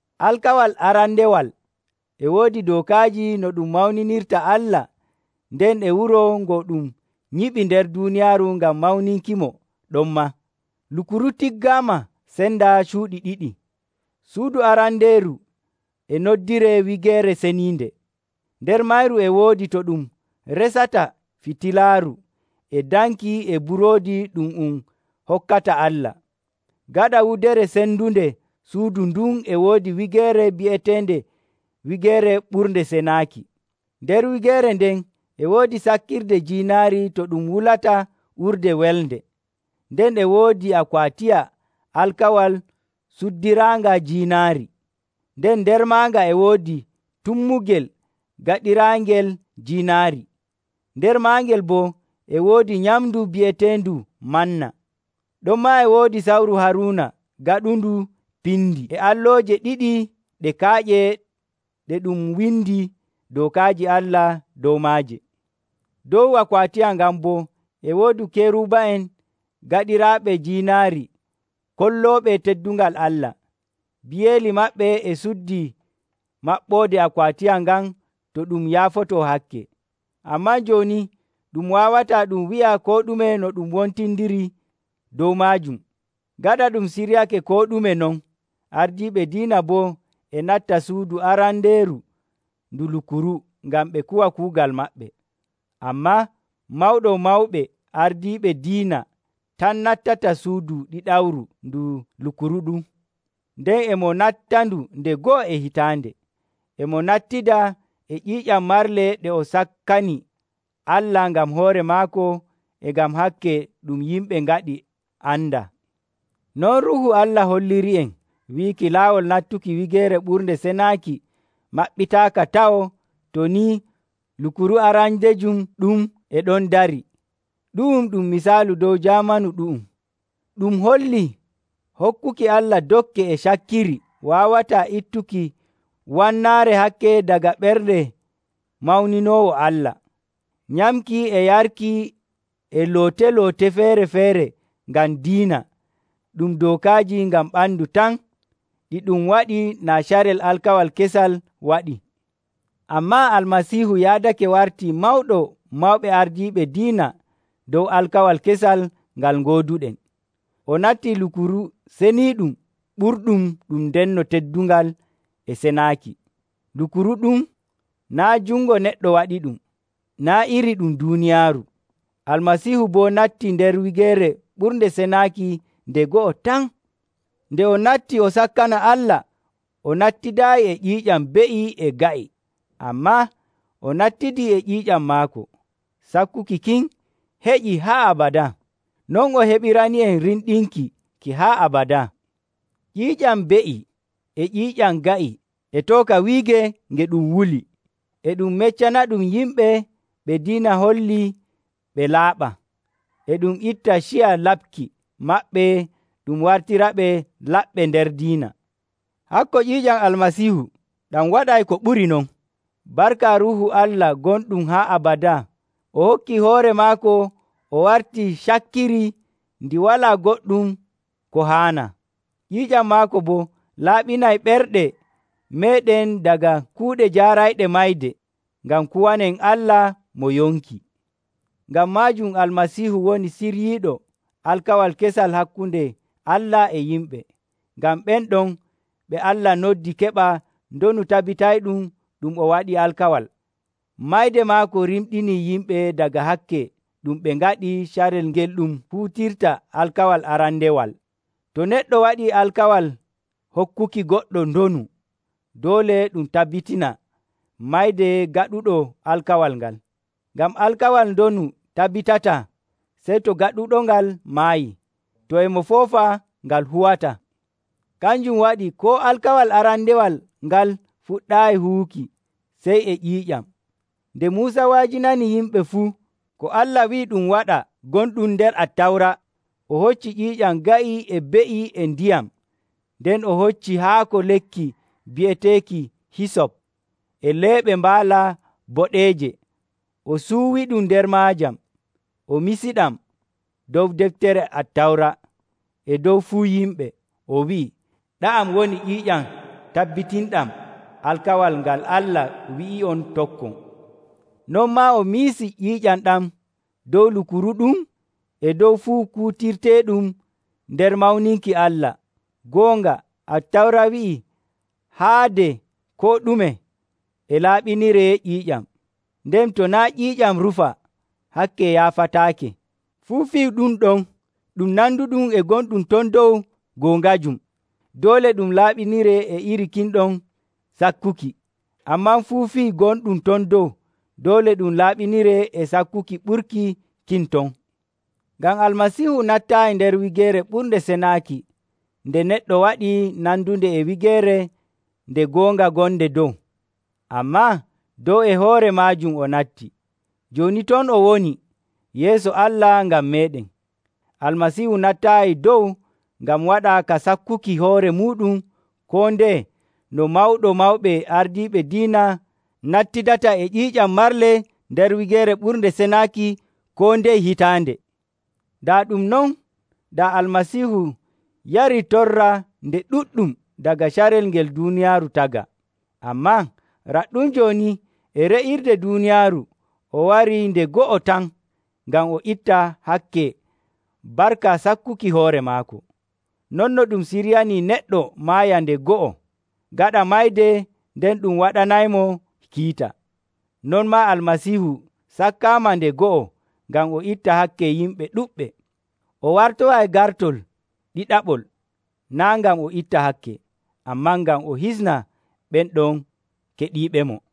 Alkawal arandewal e woodi dookaaji no ɗum mawninirta Allah nden e wuro ngo ɗum nyiɓi nder duuniyaaru ngam mawninkimo ɗonmaa. Lukuru tiggaama sendaa cuuɗi ɗiɗi. Suudu arandeeru e noddiree Wigeere Ceniinde. Nder mayru e woodi to ɗum resata fitilaaru e danki e buroodi ɗum um hokkata Allah. Gaɗa wudere cendunde suudu ndun e woodi wigeere bi'eteende Wigeere Ɓurnde Senaaki. Nder wigeere nden e woodi sakkirde jiinaari to ɗum wulata urde welnde, nden e woodi akwaatiya alkawal cuddiraanga jiinaari. Nden nder maaga e woodi tummugel gaɗiraangel jiinaari; nder maggel boo e woodi nyamndu bi'eteendu manna. Ɗonmaa e woodi sawru Haruuna gaɗundu pindi, e allooje ɗiɗi ɗe kaaƴe ɗe ɗum windi dookaaji Allah dow maaje. Dow akwaatiya ngan boo e woodi keruba'en gaɗiraaɓe jiinaari kollooɓe teddungal Allah. Biyeeli maɓɓe e cuddi maɓɓoode akwaatiya ngan to ɗum yaafotoo hakke. Ammaa jooni ɗum waawataa ɗum wi'a koo ɗume no wontindiri dow maajum. Gaɗa ɗum siryake koo ɗume non, ardiiɓe diina boo e natta suudu arandeeru ndu Lukuru ngam ɓe kuwa kuugal maɓɓe. Ammaa Mawɗo Mawɓe Ardiiɓe Diina tan nattata suudu ɗiɗawru ndu lukuru ɗum, nden e mo nattandu nde go'o e hitaande. E mo nattida e ƴiiƴam marle ɗe o sakkani Allah ngam hoore maako e ngam hakke ɗum yimɓe ngaɗi andaa. Non Ruuhu Allah holliri'en wiiki laawol nattuki Wigeere Ɓurnde Senaaki maɓɓitaaka taw to ni lukuru arandejum ɗum e ɗon darii. Ɗu'um ɗum misaalu dow jaamanu ɗu'um. Ɗum hollii hokkuki Allah dokke e cakkiri waawataa ittuki wannaare hakke daga ɓernde mawninoowo Allah. Nyamki e yarki e loote‑loote feere‑feere ngam diina, ɗum dookaaji ngam ɓandu tan, ɗi ɗum waɗi naa carel alkawal kesal waɗii. Ammaa Almasiihu yaadake wartii Mawɗo Mawɓe Ardiiɓe Diina dow alkawal kesal ngal ngooduɗen. O natti lukuru seniiɗum ɓurɗum ɗum ndenno teddungal e senaaki. Lukuru ɗum naa' jungo neɗɗo waɗiɗum, naa' iri ɗum duuniyaaru. Almasiihu boo nattii nder Wigeere Ɓurnde Senaaki nde go'o tan. Nde o natti o sakkana Allah o nattidaayi e ƴiiƴam be'i e ga'i, ammaa o nattidii e ƴiiƴam maako. Sakkuki kin heƴii haa abadaa. Non o heɓirani'en rimɗinki ki haa abadaa. Ƴiiƴam be'i e ƴiiƴam ga'i e tooka wiige nge ɗum wuli, e ɗum meccanaɗum yimɓe ɓe diina holli ɓe laaɓaa, e ɗum itta ciya laɓki maɓɓe ɗum wartiraɓe laɓɓe nder diina. Hakko ƴiiƴam Almasiihu ɗam waɗay ko ɓuri non. Barka Ruuhu Allah gonɗum haa abadaa, o hokkii hoore maako o wartii cakkiri ndi walaa goɗɗum ko haanaa. Ƴiiƴam maako boo laaɓinay ɓerɗe meeɗen daga kuuɗe jaarayɗe mayde, ngam kuwanen Allah mo yonki. Ngam maajum Almasiihu woni ciryiiɗo alkawal kesal hakkunde Allah e yimɓe, ngam ɓen ɗon ɓe Allah noddi keɓa ndonu tabitayɗum ɗum o waɗi alkawal. Mayde maako rimɗinii yimɓe daga hakke ɗum ɓe ngaɗi carel ngel ɗum huutirta alkawal arandewal. To neɗɗo waɗii alkawal hokkuki goɗɗo ndonu, doole ɗum tabbitina mayde gaɗuɗo alkawal ngal. Ngam alkawal ndonu tabbitataa sey to gaɗuɗongal maayii; to e mo foofa, ngal huwataa. Kanjum waɗi koo alkawal arandewal ngal fuɗɗaayi huwuki sey e ƴiiƴam. Nde Muusa wa'ajinani yimɓe fuu ko Allah wi'i ɗum waɗa gonɗum nder Attawra, o hoccii ƴiiƴam ga'i e be'i, e ndiyam, nden o hocci haako lekki bi'eteeki hisop e leeɓe mbaala boɗeeje, o suuwiɗum nder maajam, o misiɗam dow deftere Attawra e dow fuu yimɓe. O wi'i, “Ɗa'am woni ƴiiƴam tabbitinɗam alkawal ngal Allah wi'i'on tokkon.” Non maa o misi ƴiiƴam ɗam dow Lukuru ɗum e dow fuu kuutirteeɗum nder mawninki Allah. Goonga, Attawra wi'ii haade koo ɗume e laaɓiniree ƴiiƴam, nden to naa' ƴiiƴam rufaa, hakke yaafataake. Fuu fii ɗum ɗon ɗum nanduɗum e gonɗum ton dow goongajum, doole ɗum laaɓiniree e iri kin ɗon sakkuki. Ammaa fuu fii gonɗum ton dow, doole ɗum laaɓiniree e sakkuki ɓurki kin ton. Ngam Almasiihu nattaayi nder Wigeere Ɓurnde Senaaki nde neɗɗo waɗi nandunde e wigeere nde goonga gonde dow. Ammaa dow e hoore maajum o natti, jooni ton o woni yeeso Allah ngam meeɗen. Almasiihu nattaayi dow ngam waɗa ka sakkuki hoore muuɗum koo ndeye no Mawɗo Mawɓe Ardiiɓe Diina nattidata e ƴiiƴam marle nder Wigeere Ɓurnde Senaaki koo ndeye hitaande. Daa ɗum non, daa Almasiihu yarii torra nde ɗuɗɗum daga carel ngel duuniyaaru tagaa. Ammaa raɗɗum jooni e re'irde duuniyaaru o warii nde go'o tan ngam o itta hakke barka sakkuki hoore maako. Non no ɗum siryanii neɗɗo maaya nde go'o, gaɗa mayde nden ɗum waɗanaymo kiita, non maa Almasiihu sakkaama nde go'o ngam o itta hakke yimɓe ɗuɗɓe. O wartoyay gartol ɗiɗaɓol naa' ngam o itta hakke, ammaa ngam o hisna ɓen ɗon keɗiiɓemo.